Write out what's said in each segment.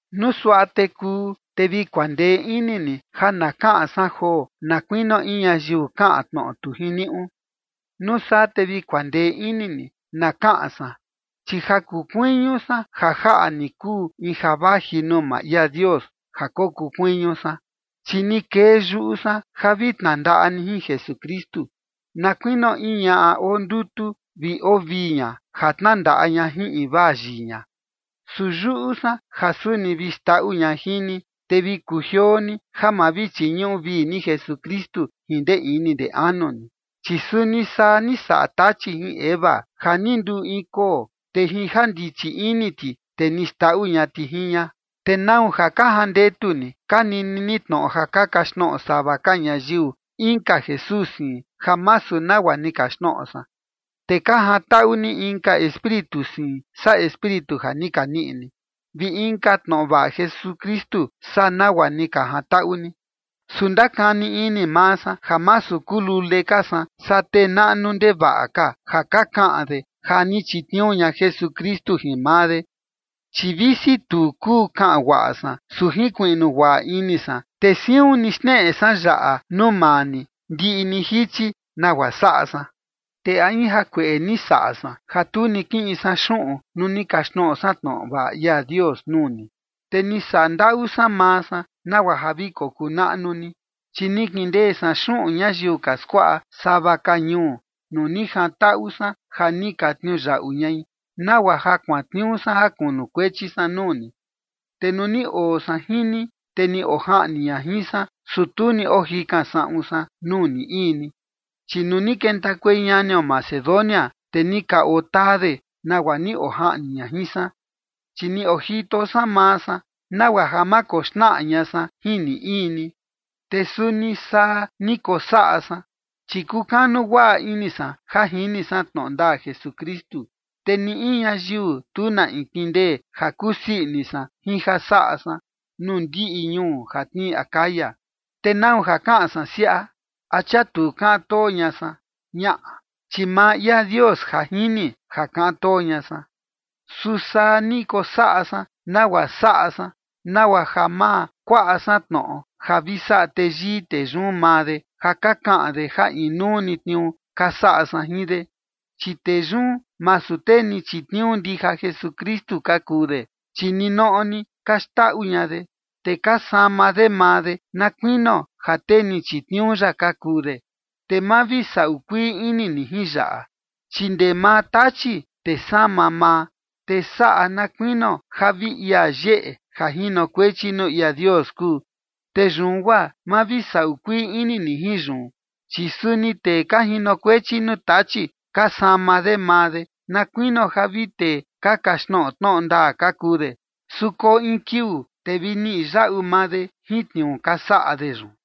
Nuu suaꞌa te kuu, te vi kuandee ini ni ja na kaꞌan san joo na kuinio in ñayiu kaꞌan tnoꞌo tu jiniuꞌu. Nuu saa te vi kuandee ini ni na kaꞌan san. Chi ja kuu kuiñu san ja jaꞌa ni kuu in ja vaji nuu maa ia Dios ja kokuu kuiñu san, chi ni kee yuꞌu san ja vi tnandaꞌa ni jin Jesukristu, na kuinio in ñaꞌa oo ndutu vi oo vii ña ja tnandaꞌa ña jin invaa yii ña. Su yuꞌu san ja suni vi xndaꞌu ña jin ni, te vi kujioo ni ja ma vi chiñuꞌu vii ni Jesukristu jin ndee ini ndee anu ni. Chi suni saa ni saꞌa Tachi jin Eva, ja ni nduu in koo, te jin ja ndichi ini ti, te ni xndaꞌu ña ti jin ña. ¿Te nau ja ka jandetu ni ka nini ni tnoꞌo ja ka kaxtnoꞌo sava ka ñayiu inka Jesús siin ja masu nagua ni kaxtnoꞌo san, te ka jantaꞌu ni inka espíritu siin saa Espíritu ja ni ka niꞌi ni, vi inka tnoꞌo vaꞌa Jesukristu saa nagua ni ka jantaꞌu ni? Su ndakani ini maa san ja masu kuu lule ka san saa tee naꞌnu ndevaꞌa ka ja ka kaꞌan de ja ni chitniuu ña Jesukristu jin maa de. Chi visi tu kuu kaꞌan guaꞌa san, su jinkuiꞌnu guaꞌa ini san, te siun ni xneꞌe san yaꞌa nuu maa ni ndiꞌi ni jichi nagua saꞌa san. ¿Te a in jakueꞌe ni saꞌa san ja tu ni kiꞌin san xuꞌun nuu ni kaxtnoꞌo san tnoꞌo vaꞌa ia Dios nuu ni? Te ni saꞌa ndaꞌu san maa san nagua ja vi kokuu naꞌnu ni. Chi ni kindee san xuꞌun ñayiu ka skuaꞌa sava ka ñuu nuu ni jantaꞌu san ja ni ka tniuyaꞌu ñai nagua ja kuantniuu san ja kunukuechi san nuu ni. Te nuu ni oo san jin ni, te ni ojaꞌni ña jin san, su tu ni ojikan saꞌun san nuu ni in ni, chi nuu ni kentakuei ñanio Macedonia, te ni ka otaa de nagua ni ojaꞌni ña jin san, chi ni ojito san maa san nagua ja ma koxnaꞌa ña san jin ni in ni, te suni saa ni kosaꞌa san. Chi kukanu guaꞌa ini san ja jini san tnoꞌo ndaa Jesukristu, te ni in ñayiu tu na in kindee ja kusii ini san jin ja saꞌa san nuu ndiꞌi ñuu ja tnii Acaya. ¿Te nau ja kaꞌan san siaꞌa? ¿A chia tu kaꞌan too ña san? Ñaꞌa, chi maa ia Dios ja jini ja kaꞌan too ña san. Su saa ni kosaꞌa san nagua saꞌa san nagua ja ma kuaꞌa san tnoꞌo ja vi saꞌa teyii tee yun maa de, ja ka kaꞌan de ja inuu ni tniuu ka saꞌa san jin de. Chi tee yun, masu tee ni chitniuu ndija Jesukristu ka kuu de, chi ninoꞌo ni ka xndaꞌu ña de, te ka sama de maa de na kuinio ja tee ni chitniuu ya ka kuu de. Te ma vi saꞌu kuii ini ni jin yaꞌa, chi ndee maa Tachi te sama maa, te saꞌa na kuinio ja vi ia yeꞌe ja jinokuechi nuu ia Dios kuu. Te yun guaa ma vi saꞌu kuii ini ni jin yun, chi suni tee ka jinokuechi nuu Tachi ka sama de maa de na kuinio ja vi tee ka kaxtnoꞌo tnoꞌo ndaa ka kuu de, su koo in kiuu te vi niꞌi yaꞌu maa de jin tniuu ja ka saꞌa de yun.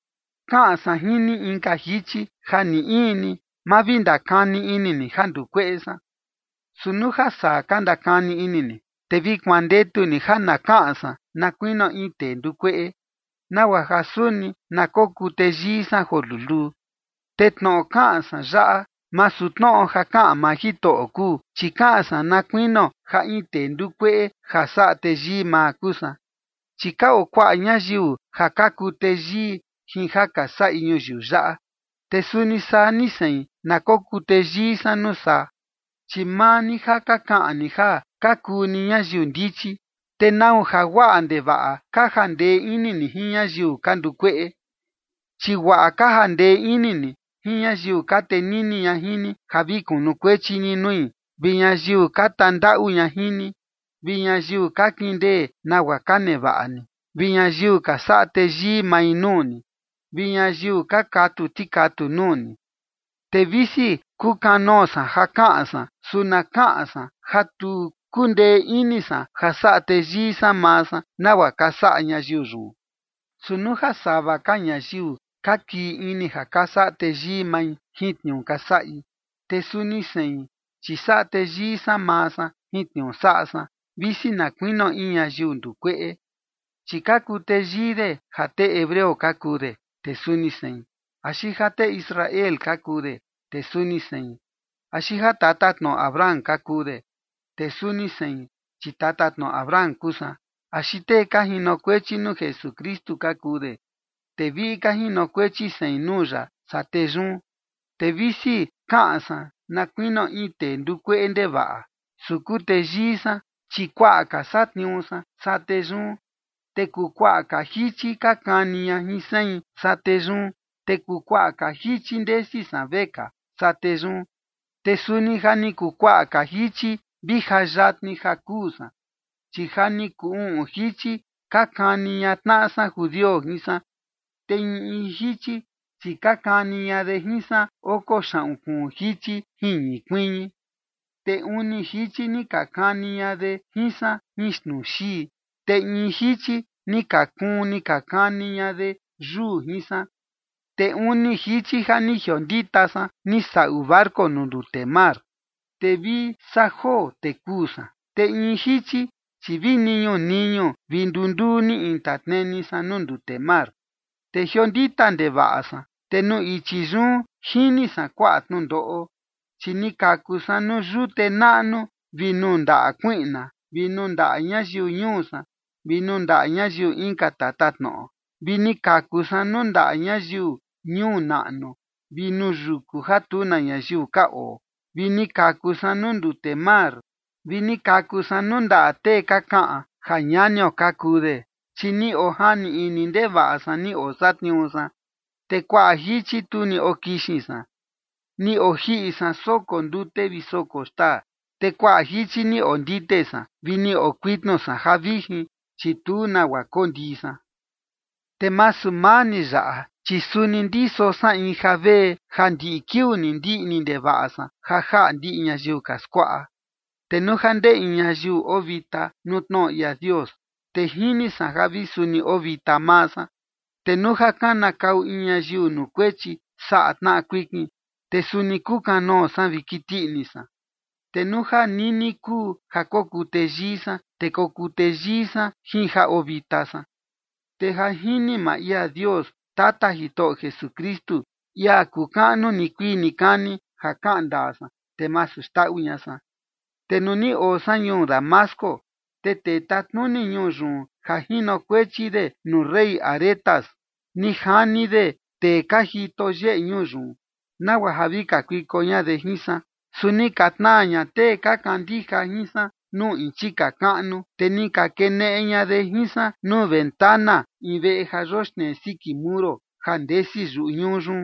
Kaꞌan san jin ni inka jichi ja ni in ni, ma vi ndakani ini ni ja nduu kueꞌe san. Su nuu ja saa ka ndakani ini ni, te vi kuandetu ni ja na kaꞌan san na kuinio in tee nduu kueꞌe, nagua ja suni na kokuu teyii san joo luluu. Te tnoꞌo kaꞌan san yaꞌa, masu tnoꞌo ja kaꞌan maa Jitoꞌo kuu, chi kaꞌan san na kuinio ja in tee nduu kueꞌe ja saꞌa teyii maa kuu san. Chi ka oo kuaꞌa ñayiu ja ka kuu teyii jin ja ka saꞌi ñuyiu yaꞌa, te suni saa ni sein na kokuu teyii san nuu saa. Chi maa ni ja ka kaꞌan ni ja ka kuu ni ñayiu ndichi, ¿te nau ja guaꞌa ndevaꞌa ka jandee ini ni jin ñayiu ka nduu kueꞌe? Chi guaꞌa ka jandee ini ni jin ñayiu ka tenini ña jin ni ja vi kunukuechi ni nui, vi ñayiu ka tandaꞌu ña jin ni, vi ñayiu ka kindee nagua ka nevaꞌa ni, vi ñayiu ka saꞌa teyii mai nuu ni, vi ñayiu ka katu tikatu nuu ni. Te visi kukanoo san ja kaꞌan san, su na kaꞌan san ja tu kundee ini san ja saꞌa teyii san maa san, nagua ka saꞌa ñayiu yun. Su nuu ja sava ka ñayiu ka kii ini ja ka saꞌa teyii mai jin tniuu ka saꞌi, te suni sein, chi saꞌa teyii san maa san jin tniuu saꞌa san, visi na kuinio in ñayiu nduu kueꞌe. Chi ka kuu teyii de ja tee hebreo ka kuu de, te suni sein. Axi ja tee Israel ka kuu de, te suni sein. Axi ja tatatnoꞌo Abraham ka kuu de, te suni sein, chi tatatnoꞌo Abraham kuu san. Axi tee ka jinokuechi nuu Jesukristu ka kuu de, te viꞌi ka jinokuechi sein nuu ya saa tee yun. Te visi kaꞌan san na kuinio in tee nduu kueꞌe ndevaꞌa, su kuu teyii san, chi kuaꞌa ka satniuu san saa tee yun. Te kuu kuaꞌa ka jichi ka kani ña jin sein saa tee yun. Te kuu kuaꞌa ka jichi ndesi san vekaa saa tee yun. Te suni ja ni kuu kuaꞌa ka jichi vi ja yatni ja kuu san. Chi ja ni kuu uꞌun jichi ka kani ña tnaꞌa san judio jin san, te in in jichi, chi ka kani ña de jin san oko xaꞌun kuun jichi jin ñii kuiñi. Te uni jichi ni ka kani ña de jin san jin xnuu xii, te in jichi ni ka kuun ni ka kani ña de yuu jin san. Te uni jichi ja ni jiondita san ni saꞌu barco nuu ndute mar, te vi saa joo, te kuu san. Te in jichi, chi vi niñu niñu vi nduu nduu ni intatneni san nuu ndute mar. Te jiondita ndevaꞌa san, te nuu ichi yun jini san kuaꞌa tnundoꞌo. Chi ni kaku san nuu yute naꞌnu vi nuu ndaꞌa kuiꞌna, vi nuu ndaꞌa ñayiu ñuu san vi nuu ndaꞌa ñayiu inka tatatnoꞌo. Vi ni kaku san nuu ndaꞌa ñayiu ñuu naꞌnu vi nuu yuku ja tu na ñayiu ka oo, vi ni kaku san nuu ndute mar, vi ni kaku san nuu ndaꞌa tee ka kaꞌan ja ñanio ka kuu de. Chi ni ojani ini ndevaꞌa san ni osatniuu san, te kuaꞌa jichi tu ni okixin san. Ni ojiꞌi san soko ndute vi soko xtaa, te kuaꞌa jichi ni ondite san vi ni okuitnu san ja vijin, chi tu nagua kondii san. Te masu maa ni yaꞌa, chi suni ndiso san in javee ja ndiꞌi kiuu ni ndiꞌni ndevaꞌa san ja jaꞌa ndiꞌi ñayiu ka skuaꞌa. Te nuu ja ndee in ñayiu oo vita nuu tnoꞌo ia Dios, te jini san ja vi suni oo vita maa san. Te nuu ja kanakau in ñayiu nuu kuechi saꞌa tnaꞌa kuikin, te suni kukanoo san vi kiti ini san. Te nuu ja nini kuu ja kokuu teyii san, te kokuu teyii san jin ja oo vita san. Te ja jini maa ia Dios, Tata Jitoꞌo Jesukristu, ia kuu kaꞌnu nikuii nikani, ja kaꞌan ndaa san, te masu xndaꞌu ña san. Te nuu ni oo san ñuu Damasco, te tee tatnuni ñuu yun ja jinokuechi de nuu rey Aretas, ni jani de tee ka jito yeꞌe ñuu yun, nagua ja vi kakuiko ña de jin san. Su ni ka tnaa ña tee ka kandija jin san nuu in chika kaꞌnu, te ni ka keneꞌe ña de jin san nuu ventana in veꞌe ja yoxnee siki muro ja ndesi yuꞌu ñuu yun,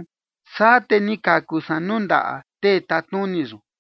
saa te ni kaku san nuu ndaꞌa tee tatnuni yun.